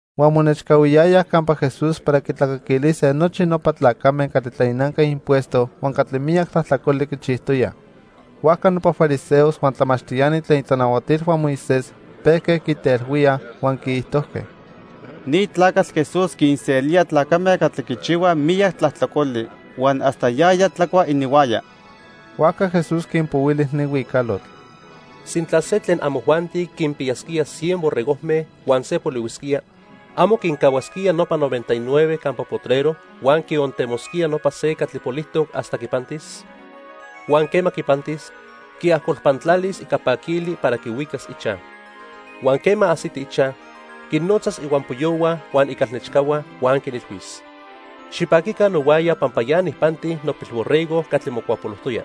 Huan monechcahuiyayaj campa Jesús para quitlacaquilise nochi nopa tlacame catli tlainanque impuesto huan catli miyac tlajtlacoli quichijtoyaj. Huajca nopa fariseos huan tlamachtiani tlen itlanahuatilhua Moisés pejque quitelhuíaj huan quiijtojque: —Ni tlacatl Jesús quinselía tlacame catli quichihuaj miyac tlajtlacoli huan hasta yaya tlacua ininhuaya. Huajca Jesús quinpohuili ni huicalotl: "Sintla se tlen amojuanti quinpiyasquía cien borregojme huan se polihuisquía, ¿amo quicahuasquía nopa noventa y nueve campa potrero huan quiontemosquía nopa se catli polijtoc hasta quipantis? Huan quema quipantis, quiajcolpantlalis ica paquili para quihuicas ichaj. Huan quema ajsiti ichaj, quinnotzas ihuampoyohua huan icalnechcahua, huan quinilhuis: 'Xipaquica nohuaya pampa ya nijpanti nopilborrego catli mocuapolojtoya.'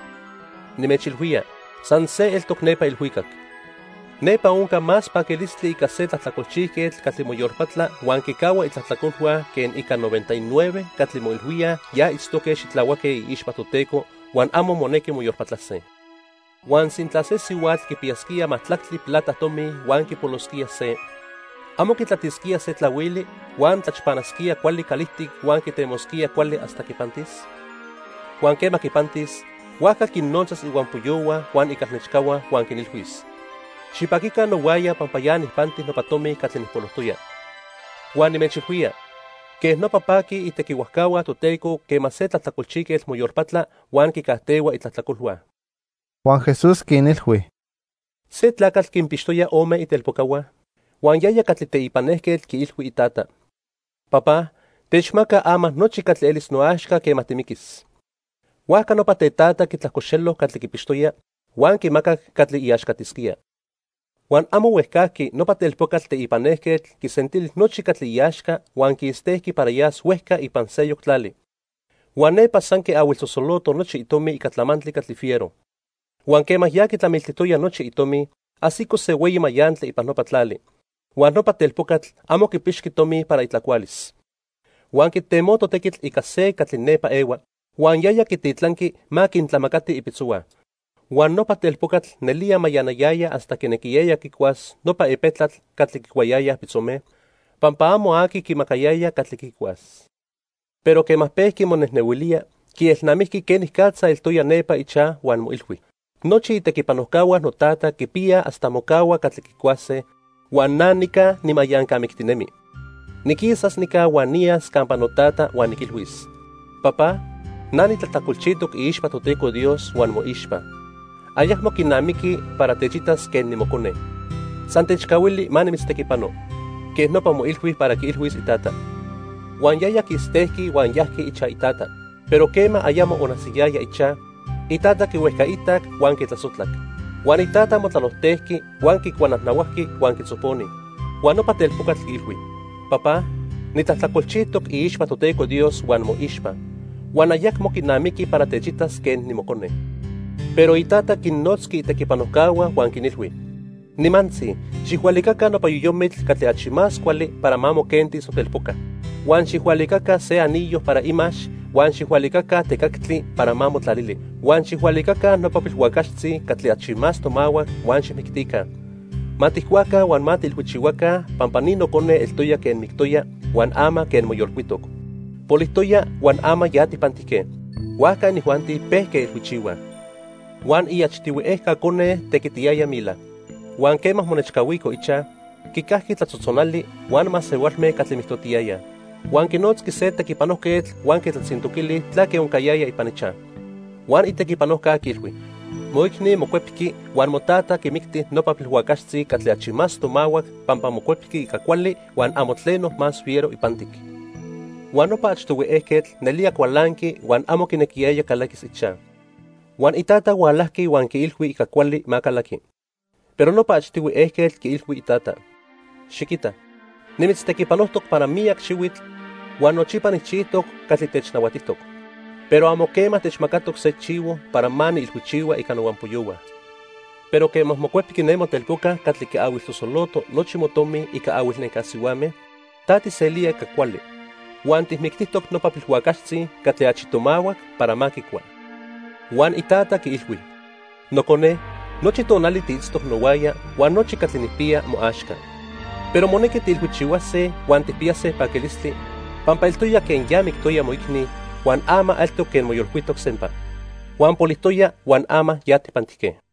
Nimechilhuía, san se eltoc nepa ilhuicac. Nepa onca más paquilistli ica se tlajtlacolchijquetl catli moyolpatla huan quicahua itlajtlacolhua que ica noventa y nueve catli moilhuíaj ya itztoque xitlahuaque iixpa Toteco, huan amo monequi moyolpatlase. "Huan sintla se sihuatl quipiyasquía majtlactli plata tomi huan quipolosquía se, ¿amo quitlatisquía se tlahuili, huan tlachpanasquía cuali calijtic huan quitemosquía cuali hasta quipantis? Huan quema quipantis, huajca quinnotzas ihuampoyohua huan icalnechcahua huan quinilhuis: 'Xipaquica nohuaya pampa ya nijpanti nopa tomi catli nijpolojtoya.' Huan nimechilhuía, quej nopa paquij itequihuajcahua Toteco quema se tlajtlacolchijquetl moyolpatla huan quicajtehua itlajtlacolhua." Huan Jesús quinilhui: "Se tlacatl quinpixtoya ome itelpocahua, huan yaya catli teipan ejquetl quiilhui itata: 'Papá, techmaca ama nochi catli elis noaxca quema timiquis.' Huajca nopa tetata quitlajcoxelo catli quipixtoya, huan quimacac catli iaxcatisquía. Huan amo huejcajqui nopa telpocatl teipan ejquetl quisentili nochi catli iaxca huan quistejqui para yas huejca ipan seyoc tlali. Huan nepa san quiahuilsosoloto nochi itomi ica tlamantli catli fiero. Huan quema ya quitlamiltijtoya nochi itomi, ajsico se hueyi mayantli ipan nopa tlali, huan nopa telpocatl amo quipixqui tomi para itlacualis. Huan quitemoto tequitl ica se catli nepa ehua, huan yaya quititlanqui ma quintlamacati ipitzohua. Huan nopa telpocatl nelía mayanayaya hasta quinequiyaya quicuas nopa epetlatl catli quicuayayaj pitzome, pampa amo aqui quimacayaya catli quicuas. Pero quema pejqui monejnehuilía, quielnamijqui quenicatza eltoya nepa ichaj huan moilhui: 'Nochi itequipanojcahua notata quipiyaj hasta mocahua catli quicuase, huan na nica nimayancamictinemi. Niquisas nica huan niyas campa notata huan niquilhuis: Papá, na nitlajtlacolchijtoc iixpa Toteco Dios huan moixpa. Ayacmo quinamiqui para techitas quen nimocone. San techcahuili ma nimitztequipano. Quej nopa moilhui para quiilhuis itata.' Huan yaya quistejqui huan yajqui ichaj itata. "Pero quema ayamo onajsiyaya ichaj, itata quihuejcaitac huan quitlasojtlac. Huan itata motlalojtejqui, huan quicuanajnahuajqui huan quitzoponi. Huan nopa telpocatl quiilhui: 'Papá, nitlajtlacolchijtoc iixpa Toteco Dios huan moixpa, huan ayacmo quinamiqui para techitas quen nimocone.' Pero itata quinnotzqui itequipanojcahua huan quinilhui: 'Nimantzi, xijhualicaca nopa yoyomitl catli achi cuali para ma moquentis notelpoca. Huan xijhualicaca se anillo para imax huan xijhualicaca tecactli para ma motlalili. Huan xijhualicaca nopa pilhuacaxtzi catli achi más tomahuac huan xijmictica. Ma tijcuaca huan ma tiilhuichihuaca, pampa ni nocone eltoya quen mictoya, huan ama quen moyolcuitoc. Polijtoya huan ama ya tijpantijque.' Huajca inijuanti pejque ilhuichihuaj. "Huan iachtihui ejca cone tequitiyaya mila. Huan quema monechcahuico ichaj, quicajqui tlatzotzonali huan masehualme catli mijtotiyayaj. Huan quinotzqui se tequipanojquetl huan quitlatzintoquili tlaque oncayaya ipan ichaj. Huan itequipanojca quiilhui: 'Moicni mocuepqui huan motata quimicti nopa pilhuacaxtzi catli achi más tomahuac pampa mocuepqui ica cuali huan amo tleno más fiero ipantic.' Huan nopa achtihui ejquetl nelía cualanqui huan amo quinequiyaya calaquis ichaj. Huan itata hualajqui huan quiilhui ica cuali ma calaqui. Pero nopa achtihui ejquetl quiilhui itata: 'Xiquita, nimitztequipanojtoc para miyac xihuitl huan nochipa nijchijtoc catli technahuatijtoc. Pero amo quema techmacatoc se chivo para ma niilhuichihua ica nohuampoyohua. Pero quema mocuepqui ne motelpoca catli quiahuilsosoloto nochi motomi ica ahuilnenca sihuame, ta tijselía ica cuali, huan tijmictijtoc nopa pilhuacaxtzi catli achi tomahuac para ma quicua.' "Huan itata quiilhui: 'Nocone, nochi tonali tiitztoc nohuaya huan nochi catli nijpiya moaxca. Pero monequi tiilhuichihuase huan tijpiyase paquilistli, pampa eltoya quen ya mictoya moicni, huan ama eltoc quen moyolcuitoc sempa. Huan polijtoya huan ama ya tijpantijque.' "